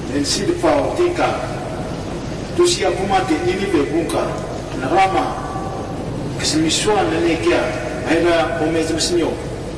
Mensintfa otinka, tusi'a kumate Ninive vunka, Nagrama kasmisua nanekea vahera ome zamasamio.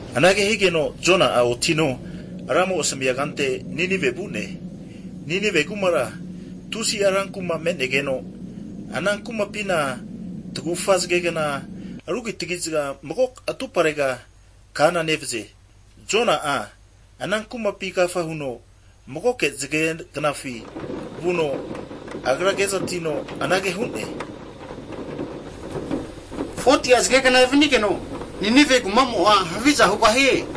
Anage higeno, Jona'a otino Ra Anumzamo'ma asamia kante anteno Ninive vu'ne. Ninive kumara tusi'a ranku'ma me'negeno ana kumapina tagufa zagegna rukitagi'za mago atuparega kana nevaze. Jona'a ana kumapi agafa huno, magoke zagegnafi vuno, agra kezatino anage hu'ne, 40'a zagegna evanigeno Ninive kumamo'a haviza hugahie.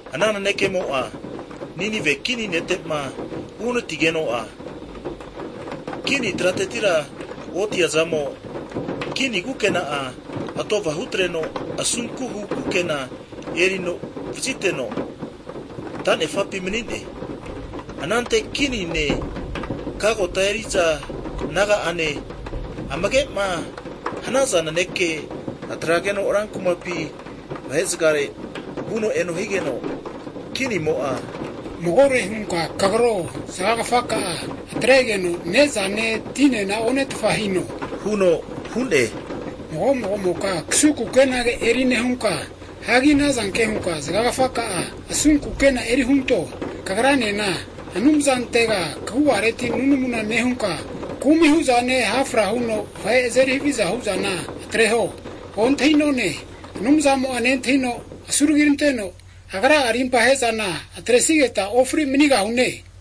Ana nanekemo'ma Ninive kini nete'ma uhanatigeno'a, kini tratetira otiazamo, kini kukena'a atova hutreno, asunku kukena erino antaniteno, ta'nefapi mani'ne. Anante kinine, kagota eri'za naga'ane amage'ma antesaza naneke atrageno ran kumapi vahe'zagare vuno eno higeno, kinimo'a huno magore hunka kagro, zagagafaka'a, atregeno ne'zane, tinena one'tfa hino, huno hu'ne. Mago mago'moka kasunku kenage eri nehunka, hagi ana zanke hunka zagagafaka'a asunku kukena eri hunto. Kagranena Anumzantega kagu'areti hunka nunamuna nehunka, kumi hu'zane, ha' fra huno vahe azeri haviza hu'zana atreho. Ontahi'none, Anumzamo'a nentahino asuragi ranteno Agra'a rimpa ahe'zana atresigeta ofri manigahune.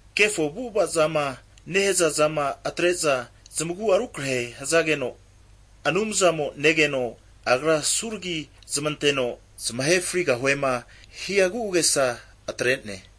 Kefo avu'ava zama nehaza zama atre'za zamagu'a rukrahe hazageno, Anumzamo'a negeno, Agra asunku huzmanteno zamahe frigahuema hia agu'agesa atre'ne.